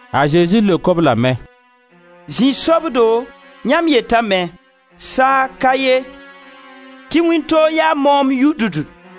A Zezi leok-b lame: «Zĩ-sobdo yãmb yetame: saag ka ye tɩ wĩntoog yaa moomd yʋdʋd.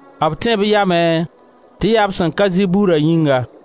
b tẽe b yamẽ tɩ yaa b sẽn ka zɩ burã yĩnga.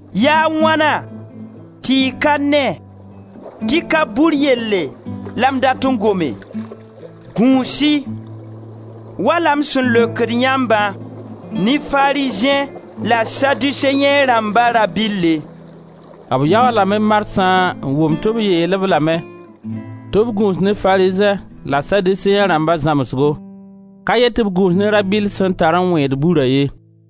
Yaa a wãna tɩ y ka ne tɩ ka bur yelle la m dat n gome? Gũus-y, wala m sẽn leokd yãmbã, ne Farizẽ la Saduseẽ rãmba rabɩlle.» B yaoolame marsã n wʋm tɩ b yeel-b lame tɩ b gũus ne Farizẽ la Saduseẽ rãmba zãmsgo, ka yet tɩ b gũus ne rabɩll sẽn tar n wẽed bura ye.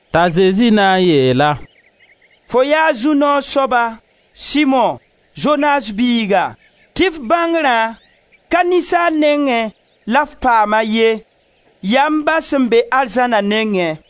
T'a Zezi na n yeel-a: «Fo yaa zu-noog soaba, Simo, Zonas biiga, tɩ f bãngrã, ka ninsaal nengẽ la f paam-a ye, yaa m Ba sẽn be arzãna nengẽ.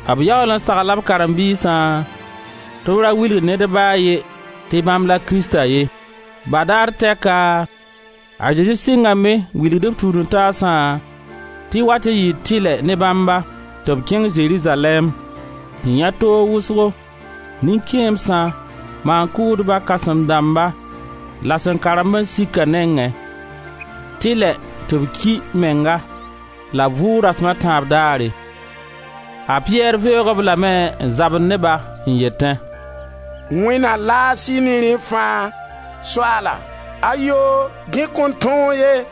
B yaool n sagla b karen-biisã tɩ b ra wilg ned ba a ye tɩ bãmb la Krista ye. Badaare tɛka a Zezi sɩngame n wilg b tũud-n-taasã tɩ wat n yɩɩ tɩlɛ ne bãmba tɩ b kẽng Zerizalɛɛm, n yãe toogo wʋsgo, nin-kẽemsã, maan-kʋʋdba kãsem dãmba la Sẽn karen-ba-n-sikã nengẽ, tɩlɛ tɩ b ki menga la b vʋʋg dasm a tãab daare. A Piyɛr veoog-b lame, n zabd ne-ba, n yetẽ: «Wẽnd na laas-y ne rẽ fãa, Soaala, ayoo, dẽ kõn tõog ye!»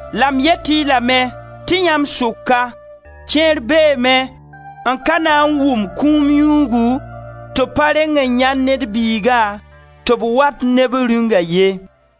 La m yet-y lame tɩ yãmb sʋka, kẽer beeme n ka na n wʋm kũum yũugu tɩ b pa reng n yãend Ned Biiga tɩ b wat ne b Rĩunga ye.»